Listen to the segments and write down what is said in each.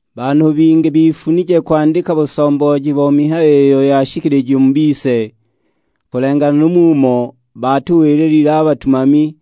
Banhu bingi bifunije kwandika busombooji bo mihayo iyo yashikilijiwe mu bise, kulenganila nu mumo baatuwililile a batumami,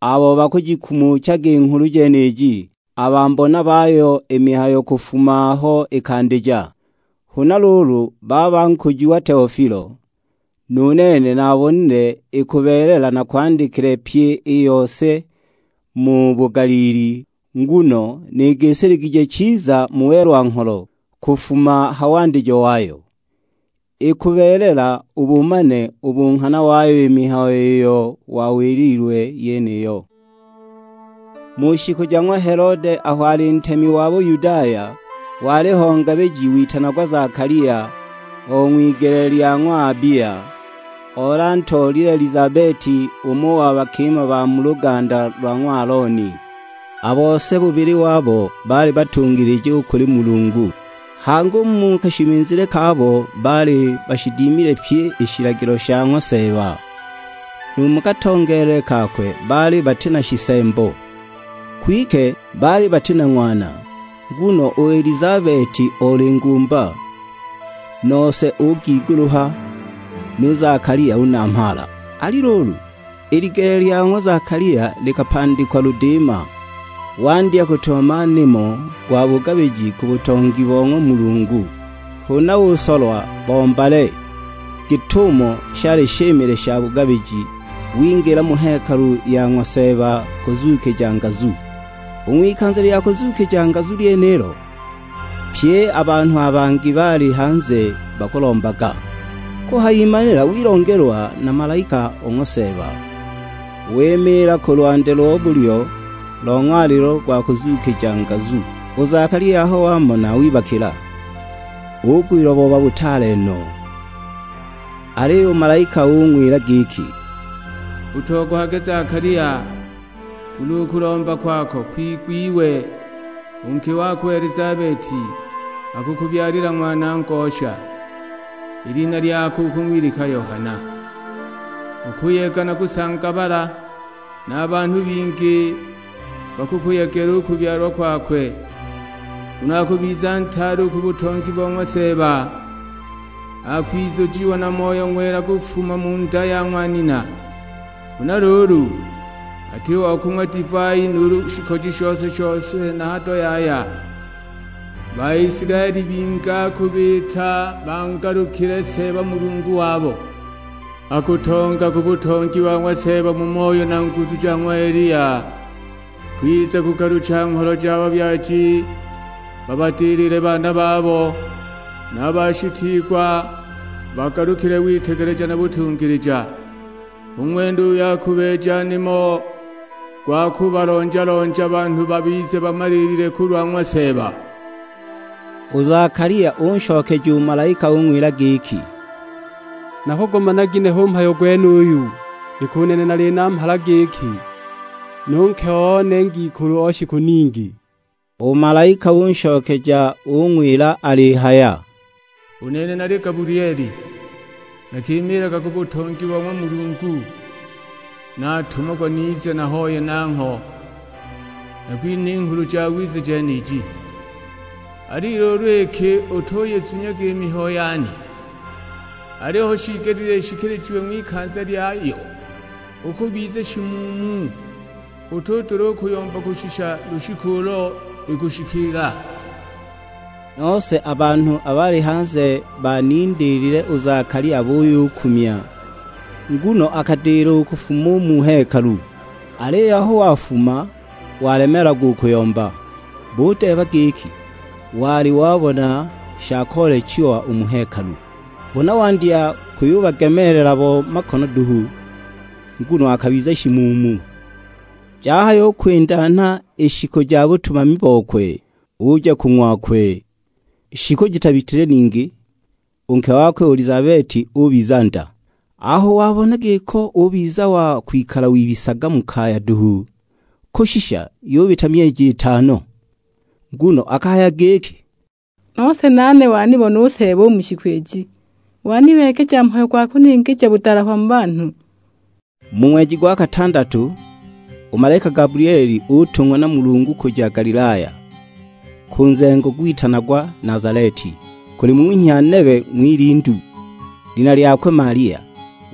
abo bakujikumuchaga i Nghulu jeniji; a bambona bayo i mihayo kufuma aho ikandija. Huna luulu baba nkujiwa Teofilo, nu nene naabonile ikubeelela nakwandikile pyi i yose mu bugaliili, nguno nigisiligije chiza mu welwa-ngholo, kufuma ha wandijo wayo. Ikubeelela ubumane u bunghana wayo i mihayo iyo wawililwe yeniyo. Mu shiku ja ng'wa Helode aho ali ntemi wa Buyudaya, waliho ngabiji witanagwa Zakalia, o ng'wigele lya ng'wa Abia. Oli antoolile Elizabeti, umo wa bakima ba mu luganda lo ng'wa Alooni. A bose bubili wabo, baali batungilija u kuli Mulungu. Hangi u mu kashimizile kabo baali bashidimile pyi i shilagilo sha ng'wa Seeba; nu mu katongeelele kakwe baali bati na shisembo. Kwike baali bati na ng'wana, nguno u Elizabeti oli ngumba, nose ugiguluha, nu Zakalia unamhaala. Ali luulu, i ligele lya ng'wa Zakalia likapandikwa ludiima, wandya kutumama nimo gwa bugabiji ku butongi bo ng'wa Mulungu. Huna usolwa bo mbale, git'umo shali shimile sha bugabiji, wingila mu hekalu ya ng'wa Seeba kuzuukija ngazu. U ng'wikanza lya kuzuukija ngazu lyenilo, pye a banhu a bangi baali hanze bakulombaga. Kuhayimanila wilongelwa na malaika o ng'wa Seeba; wimiila ku lwandi lo bulyo lo ng'walilo go kuzuukija ngazu. U Zakalia aho wamona wibakila, ugwilwa booba butaale no! Aliyo u malaika ung'wila giki, "Utogohage Zakalia, nguno u kulomba kwako kwigwiwe; u nke wako u Elizabeti akukubyalila ng'wana ngosha, i lina lyakwe ukung'wilika Yohana. Ukuyega na kusangabala, na banhu bingi bakukuyegela u kubyalwa kwakwe, nguno akubiza ntaale u ku butongi bo ng'wa Seeba. Akwizujiwa na Moyo Ng'wela kufuma mu nda ya ng'wa nina. Huna luulu, ati wa kung'wa divai nuulu shikoji shose-shose na hado yaya. Baisilaeli bingi akubiita bangalukile Seeba Mulungu wabo. Akutonga ku butongi bo ng'wa Seeba mu moyo na nguzu ja ng'wa Eliya, kwiza kugalucha ngholo ja babyaji babadilile baana babo, na bashitiigwa bagalukile witegeleja na butungilija. Hu ng'wene uyo akubeeja nimo gwa kubalonja-lonja banhu babize bamaliilile kulwa ng'wa Seeba." U Zakalia unshokeja u malaika ung'wila giki, "Nakugumana ginehe u mhayo gwenuyu? Iki u nene nali namhala giki, nu nke one ngikulu o shiku ningi!" U malaika unshokeja ung'wila alihaya, "U nene nali Gabulieli, nakimiilaga ku butongi bo ng'wa Mulungu. Natumagwa nize nahoye nangho, nakwinhe i Nghulu Jawiza jeniji. Ali luulu iki utuyizunyaga i mihayo yane, aliyo hu shiigelile ishikilijiwe ng'wikanza lyayo, ukubiza shimuumu. Utudula u kuyomba kushisha lushiku ulo ikushikiila." Nose a banhu abo baali hanze banindiilile u Zakalia buyukumya, nguno akadila u kufuma u mu hekalu. Aliyo aho wafuma walemeelagwa u kuyomba, budeeba giki wali wabona sha koolechiwa u mu hekalu. Huna wandya kuyubagemeelela bo makono duhu, nguno akabiza shimuumu. Jahayukwindanha i shiku ja butumami bokwe, uja ku ng'wakwe. Shiku jitabitile ningi, u nke wakwe u Elizabeti ubiza nda; aho wabona giko ubiza wa kwikala wibisaga mu kaya duhu, kushisha yubita myeji itano. Nguno akahaya giki, "Nose nane wanibona u Seeba u mu shiku iji, wanibeegeja mhayo gwa kuningija budalahwa mu banhu!" ''Mu ng'weji gwa katandatu, u malaika Gabulieli utung'wa na Mulungu kuja Galilaya, ku nzengo gwitanagwa Nazaleti; kuli munhya nebe ng'wilindu, lina lyakwe Malia,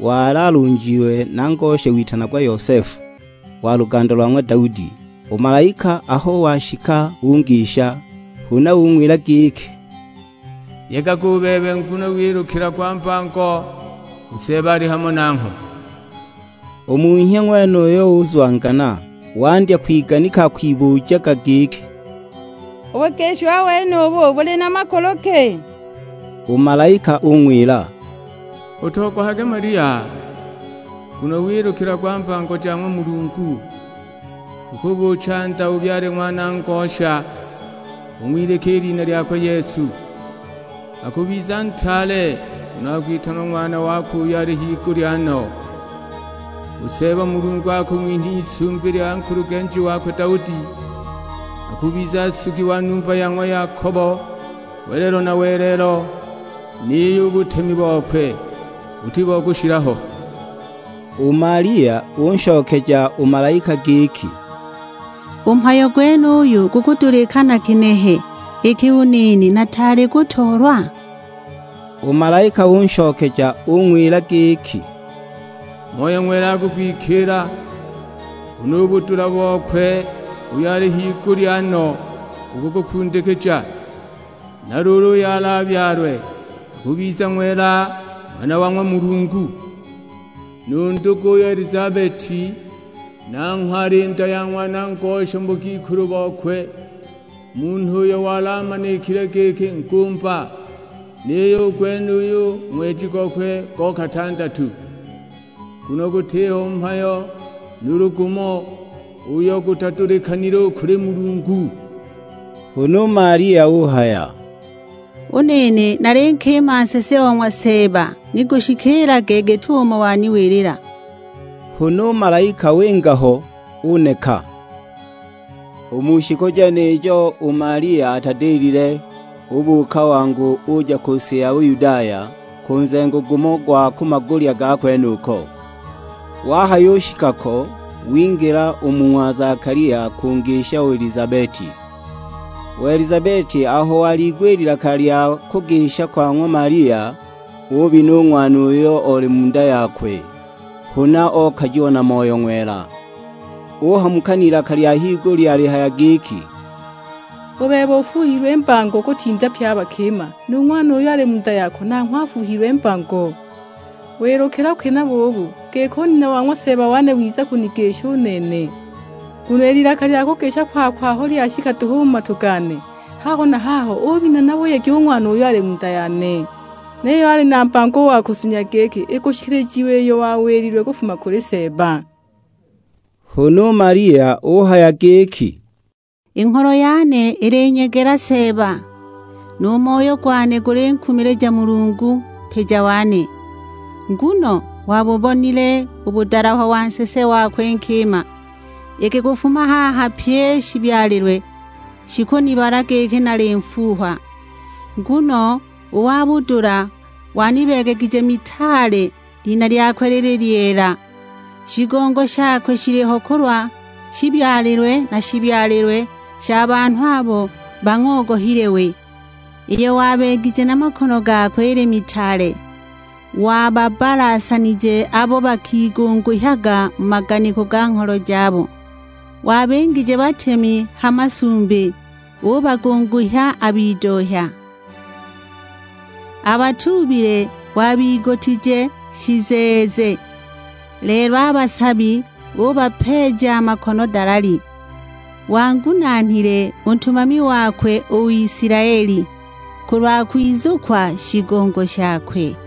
wali alunjiwe na ngosha witanagwa Yosefu, wa luganda lwa ng'wa Daudi. U malaika aho washika ungisha; huna ung'wila giki, "Yegaga u bebe nguno wilukilagwa mbango; u Seeba ali hamo nangho!" U munhya ng'wenuyo uzwangana, wandya k''wiganika akwibujaga giki, "U bugishiwa wenubu buli na makulu ki!" U malaika ung'wila, "Utogohage Malia, nguno wilukilagwa mbango ja ng'wa Mulungu. Ukubuucha nda ubyale ng'wana ngosha, ung'wilike i lina lyakwe Yesu. Akubiza ntaale, nguno akwitanwa Ng'wana wakwe uyo ali higulya no. U Seeba Mulungu akung'winha i lisumbi lya nkulugenji wakwe Daudi. Akubiza nsugi wa numba ya ng'wa Yakobo welelo na welelo, niyo u butemi bokwe buti bo kushila ho." U Malia unshokeja u malaika giki, "U mhayo gwenuyu gukudulikana ginehe, iki u nene nataali kutoolwa?" U malaika unshokeja ung'wila giki, "Moyo Ng'wela akukwikiila, huna u budula bokwe uyo ali higulya no bukukukundikija. Na luulu uyo alabyalwe akubiza Ng'wela, Ng'wana wa ng'wa Mulungu. Nu'' nduguyo u Elizabeti'', nanghwe ali nda ya ng'wana ngosha mu bugikulu bokwe; munhu uyo wali amanikile giki ngumba. Niyo u gwenuyu ng'weji gokwe go katandatu. Nguno gutiho mhayo nuulu gumo, uyo gutadulikanile u kuli Mulungu." Huna u Malia uhaya, "U nene nali nkima nsese o ng'wa Seeba; ni gushikiilage git'umo waniwilila." Huna u malaika winga ho, uneka. U mu shiku jenijo u Malia atadilile, ubuuka wangu uja ku si ya Buyudaya, ku nzengo gumo gwa ku magulya ga kwenuko. Wahayushika ko wingila u mu ng'wa Zakalia kungisha u Elizabeti. U Elizabeti aho waliigwa i lilaka lya kugisha kwa ng'wa Malia, ubina u ng'wana uyo oli mu nda yakwe, huna okajiwa na Moyo Ng'wela. Uhamuka n'ilaka lya higulya alihaya giki, "U bebe ufuuhilwe mbango kutinda pye a bakima. Nu ng'wana uyo ali mu nda yako nanghwe afuuhilwe mbango. Wilukilwa ki nabo ubu, giki u nina wa ng'wa Seeba wane wiza kunigisha u nene! Nguno i lilaka lya kugisha kwako aho lyashika duhu u mu matu gane, haho na haho obina na buyegi u ng'wana uyo ali mu nda yane! Niyo ali na mbango u wa kuzunya giki ikushikilijiwa iyo wawililwe kufuma kuli Seeba." Huna u Malia uhaya giki, "I ngholo yane ilinyegela Seeba, nu moyo gwane gulinkumilija Mulungu, Mpija wane. Nguno wabubonile u budalahwa wa nsese wakwe nkima, iki kufuma haha pyi i shibyalilwe, shikunibala giki nali nfuuhwa. Nguno u wa budula wanibeegegije mitaale; lina lyakwe lili lyeela. Shigongo shakwe shiliho kulwa, shibyalilwe na shibyalilwe sha banhu abo bang'ogohile we. Iyo wabeegije na makono gakwe ili mitaale, wababbalasanije abo bakigunguhyaga mu maganiko ga ngholo jabo. Wabingije batemi ha masumbi, ubagunguhya a bidohya. A batuubile wabigutije shizeeze, lelo a basabi ubapeeja makono dalali. Wangunaanile u ntumami wakwe u Isilaeli, kulwa kwizukwa shigongo shakwe;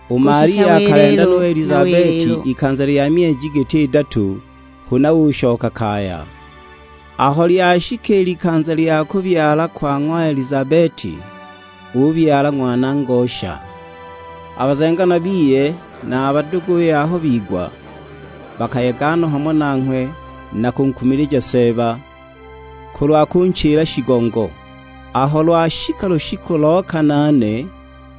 U Malia akalenda nu Elizabeti ikanza lya myeji giti idatu, huna ushoka kaya. Aho lyashika i likanza lya kubyala kwa ng'wa Elizabeti, ubyala ng'wana ngosha. A bazenganwa biye na a baduguye aho bigwa, bakayega no hamo nanghwe na kunkumilija Seeba, kulwa kunchila shigongo. Aho lwashika lushiku lo kanaane,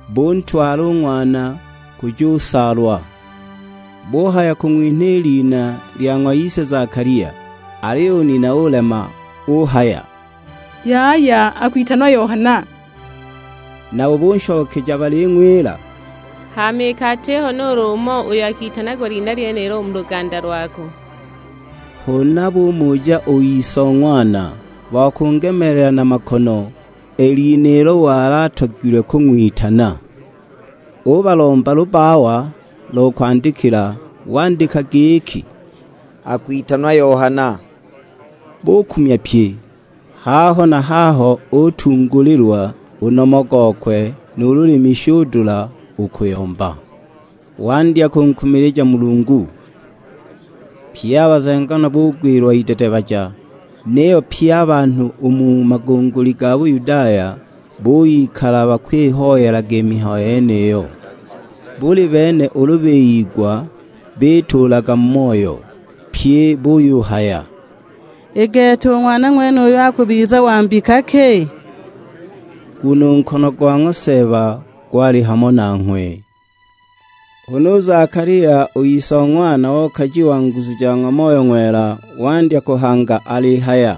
buntwala u ng'wana kujusaalwa. Buhaya kung'winha i lina lya ng'wa ise Zakalia. Aliyo u nina ulema uhaya, "Yaya; akwitanwa Yohana." Nabo bunshokeja baling'wila: "Hama iki atiho nuulu umo uyo akitanagwa lina lyenilo u mu luganda lwako!" Huna bumuja u ise o ng'wana, bo kungemeelela na makono, i lina ilo wali atogilwe kung'witana. Ubalomba lubbawa lo kwandikila; wandika giki, "Akwitanwa Yohana." Bukumya pye. Haho na haho utungulilwa; u nomo gokwe nu lulimi shudula u kuyomba, wandya kunkumilija Mulungu! Pye a bazenganwa bugwilwa idedebaja; niyo pye a banhu u mu magunguli ga Buyudaya buyikala bakwihoyelaga i mihayo yeniyo. Buli bene ulu biyigwa bituulaga mu moyo, pyi buyuhaya, "I gete u ng'wana ng'wenuyu akubiza wa mbika ki?" Nguno u nkono go ng'wa Seeba gwali hamo nanghwe! Huna u Zakalia, u ise o ng'wana, okajiwa nguzu ja ng'wa Moyo Ng'wela, wandya kuhanga alihaya,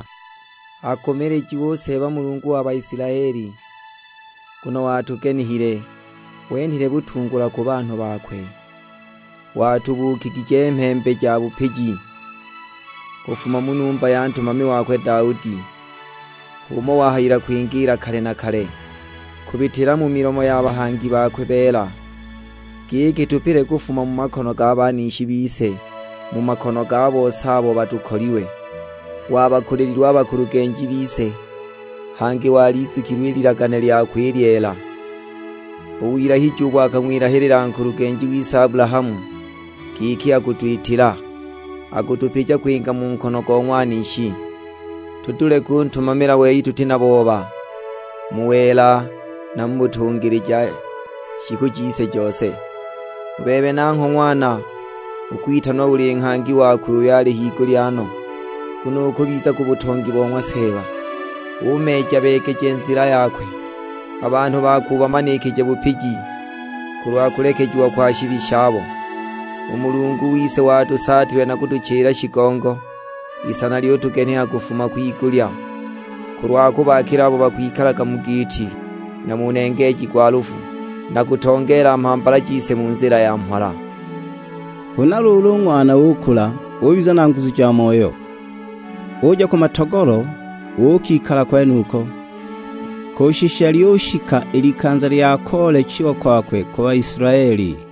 "Akumilijiwe u Seeba Mulungu wa Baisilaeli. Nguno watugenihile, wenhile butungulwa ku banhu bakwe. Watubuukigije mhembe ya bupiji, kufuma mu numba ya ntumami wakwe Daudi. H'umo wahayila kwingiila kale na kale, kubitila mu milomo ya bahangi bakwe beela. Giki tupile kufuma mu makono ga banishi bise; mu makono ga bose abo batukolilwe. Wabakulililwe a bakulugenji bise, hangi walizukilwe i lilagane lyakwe i lyeela. U wilahiji ubo akang'wilahilila nkulugenji wise Abulahamu, giki akutwitila, kutupija kwinga mu nkono go ng'wanishi, tudule kuntumamila we tuti na booba; mu wela na mu butungilija shiku jise jose. U bebe nangho ng'wana, ukwitanwa uli nghangi wakwe uyo ali higulya no; nguno ukubiza ku butongi bo ng'wa Seeba, umeeja-beegeje nzila yakwe. A banhu bakwe ubamanikije bupiji, kulwa kulekejiwa kwa shibi shabo. U Mulungu wise watusaatilwe na kutuchila shigongo; Isana lyutugeniha kufuma kwigulya, kulwa kubaakila abo bakwikalaga mu giiti, na mu nengeeji gwa lufu; na kutongeela mhambala jise mu nzila ya mhola." Huna luulu u ng'wana ukula, ubiza na nguzu ja moyo. Uja ku matogolo uukikala kwenuko, kushisha lyushika i likanza lya koolechiwa kwakwe ku Baisilaeli.